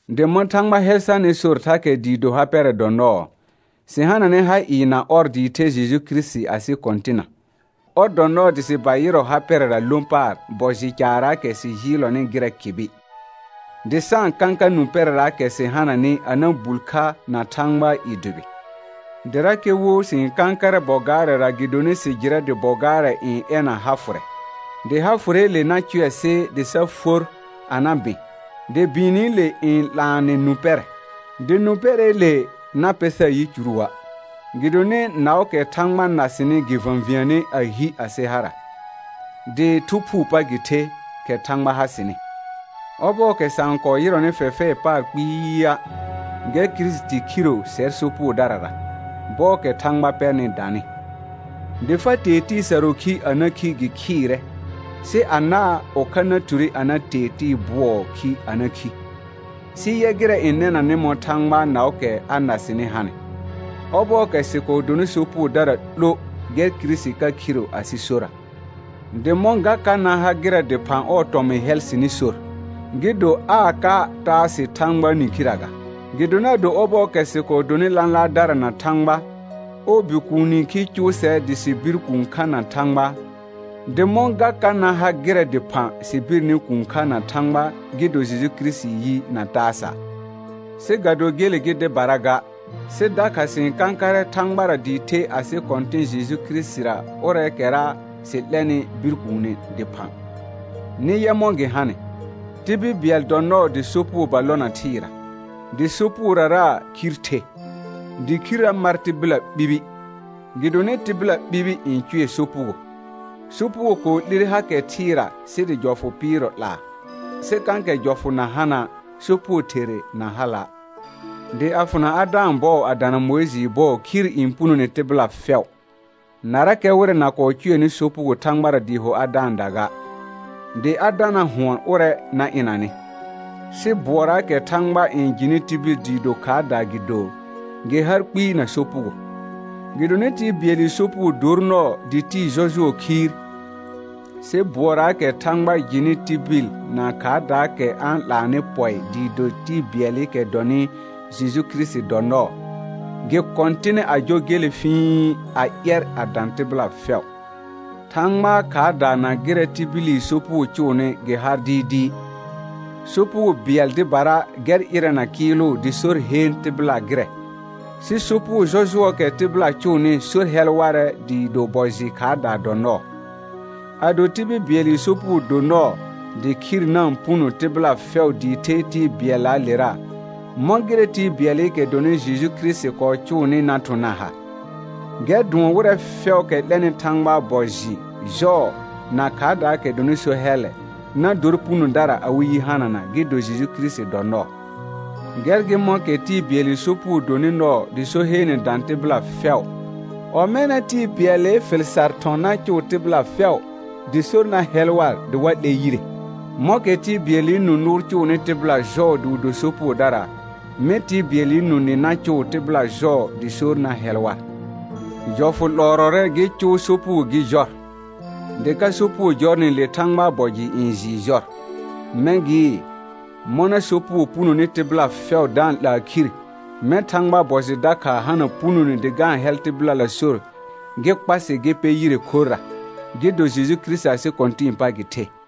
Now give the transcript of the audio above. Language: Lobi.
Dɩ mɔ̃ Thãgba hɛl sarnɩ sor thakɛ dɩɩ do ha pɛrɛ dɔ nɔɔ, sɩ hananɛ ha ɩɩ na ɔr dɩɩ the Jeju Kirisiti asɩ Kɔ̃tɩna. Ɔr dɔ nɔɔ dɩ sɩ ba yɩrɔ ha pɛrɛra lõ paar bɔ jɩ caarraakɛ sɩ jɩɩlɔnɩ gɩrɛ kɩbɩ, dɩ sa-n kãka nũ pɛrɛraakɛ sɩ hananɩ a na bul kha na Thãgbaa i dʋbɩ. Dɩrakɛ wo sɩ-n kãkarɛ bɔ gaarɛra gɩdonɩ sɩ jɩrɛ dɩ bɔ gaarɛ n ɛna ha fʋrɛ, dɩ ha fʋrɛɛle na cʋɛ sɩ dɩ sa for a na bɩ̃, dɩ bɩɩnɩle n 'laanɛ nũ pɛrɛ. Dɩ nũ pɛrɛɛle na pɛ sar yicuruə', gɩdonɩ naʋʋkɛ Thãgba na sɩnɩ gɩ və̃viəne a hi asɩ hara, dɩ Thu Phuu pa gɩ the, kɛ Thãgba ha sɩnɩ. Ɔbɔɔkɛ sa-n kɔɔ yɩrɔnɩ fɛfɛɛ paar kpɩɩa', gɛr Kirisiti khiro sɛr sopugodarara, bɔɔkɛ Thãgba pɛrnɩ danɩ. Dɩ fa tee tɩɩ sarʋʋ khi a na khi gɩ khɩɩrɛ, sɩ anaa ʋkha na ture a na tee tɩɩ bʋɔɔ khi a na khi. Sɩ yɛ gɩrɛ n nɛnanɩ mɔ̃ Thãgbaa naʋʋkɛ a na sɩnɩ hanɩ: Ɔbɔɔkɛ sɩ kɔɔ donɩ sopugodara 'lo gɛr Kirisiti ka khiro asɩ sora. Dɩ mɔ̃ ga ka na ha gɩrɛ dɩphã ɔɔ tɔmɩ̃ hɛl sɩnɩ sor, gɩ do aa ka taa sɩ Thãgbaa nĩkhirə ga. Gɩdonɩ ado ɔbɔɔkɛ sɩ kɔɔ donɩ lãlaardara na Thãgba, ɔɔ Bikuuni khi cʋʋ sɛr dɩ sɩ bir kũu kha na Thãgba; dɩ mɔ̃ ga ka na ha gɩrɛ dɩphã sɩ birni kũu kha na Thãgba gɩ do Kirisitii yi na taa sa'. Sɩ ga do gele gɩ dɩbara ga, sɩ dakha sɩ-n kãkarɛ Thãgbara dɩɩ the asɩ Kɔ̃tɩ̃ Jeju Kirisitira ʋrɛɛkɛra sɩ 'lɛrnɩ bir kuune dɩphã. Nɩ yɛ mɔ̃ gɩ hanɩ: Tibil bɩɛl dɔ nɔɔ dɩ sopugo ba lona thɩɩra, dɩ sopugorara khir the, dɩ khirrə mar tɩbɩla ɓibi, gɩdonɩ tɩbɩla ɓibi n cʋɛ sopugo. Sopugo kɔɔ 'lire hakɛ thɩɩra sɩ dɩ jɔfʋ pɩɩrɔ 'laa, sɩ kãkɛ jɔfʋ na hana', sopugo therre na hala'. Dɩ a fʋna Adãa bɔɔ a dana Mʋɩjɩɩ bɔɔ khir n punone tɩbɩla fɛʋ, narakɛ wɩrɛ na kɔɔ cʋɛnɩ sopugo Thãgbara dɩɩ ho Adãada ga; dɩ Adana hʋɔn ʋrɛ na ɩnanɩ. Sɩ bʋɔraakɛ Thãgba n jɩnɩ tibil dɩɩ do khaardaa gɩ do, gɩ har kpɩɩ na sopugo. Gɩdonɩ tɩɩ bɩɛlɩ sopugo dor nɔɔ dɩ tɩɩ jɔjʋɔ khiir, sɩ bʋɔraakɛ Thãgba n jɩnɩ tibil na khaardaakɛ a-n 'laanɩ pɔɩ dɩɩ do tɩɩ bɩɛlɩkɛ dɔnɩ Jeju Kirisiti dɔ nɔɔ, gɩ kɔ̃tɩnɛ a jɔ gele fɩ̃i a ƴɛr a dã tɩbɩla fɛʋ. Thãgbaa khaarda na gɩrɛ tibili sopugo cʋʋnɩ gɩ har dɩɩdɩɩ: Sopugo bɩɛl dɩbara gɛr ɩrɛna kɩɩlʋ dɩ sor heen tɩbɩla gɩrɛ, sɩ sopugo jɔjʋɔɔkɛ tɩbɩla cʋʋnɩ sor ka hɛl warɛ dɩɩ do bɔ jɩ khaardaa dɔ nɔɔ. Ado tibil bɩɛlɩ sopugo do nɔɔ dɩ khir na-n puno tɩbɩla fɛʋ dɩɩ the tɩɩ bɩɛllaalera, mɔ̃ gɩrɛ tɩɩ bɩɛlɩkɛ dɔnɩ Jeju Kirisiti kɔɔ cʋʋnɩ na thʋ̃ na ha? Gɛr dʋɔn wɩrɛ fɛʋʋkɛ 'lɛnɩ Thãgbaa bɔ jɩ jɔɔ na khaardaakɛ dɔnɩ so hɛllɛ, na dor punodara awɩ yi hanana gɩ do Jeju Kirisiti dɔ nɔɔ. Gɛr gɩ mɔ̃kɛ tɩɩ bɩɛlɩ sopugo donɩ nɔɔ dɩ so heene dã tɩbɩla fɛʋ, ɔmɛna tɩɩ bɩɛlɩ fɩl sar thɔ̃ na cuu tɩbɩla fɛu dɩ sor na hɛl war dɩ wa 'lɛ yire. Mɔ̃kɛ tɩɩ bɩɛlɩ nũ nʋʋr cʋʋnɩ tɩbɩla jɔɔ dɩ wɩ do sopugodara, mɛ̃ tɩɩ bɩɛlɩ nũ nɩ na cʋʋ tɩbɩla jɔɔ dɩ sor na hɛl war. Jɔfʋ 'lɔɔrɔrɛ gɩ cʋʋ sopugo gɩ jɔr, dɩ ka sopugo jɔrnɩ le Thãgbaa bɔ jɩ n jɩɩ jɔr. Mɛ̃ gɩɩ, mɔna sopugo punoni tɩbɩla fɛʋ da-n 'laa khir, mɛ̃ Thãgbaa bɔ jɩ dakha hana punone dɩ ga-n hɛl tɩbɩlala sor gɩ kpa sɩ gɩ pɛ yire khorra, gɩ do Jeju Kirisiti asɩ Kɔ̃tɩ̃ɩ pa gɩ the.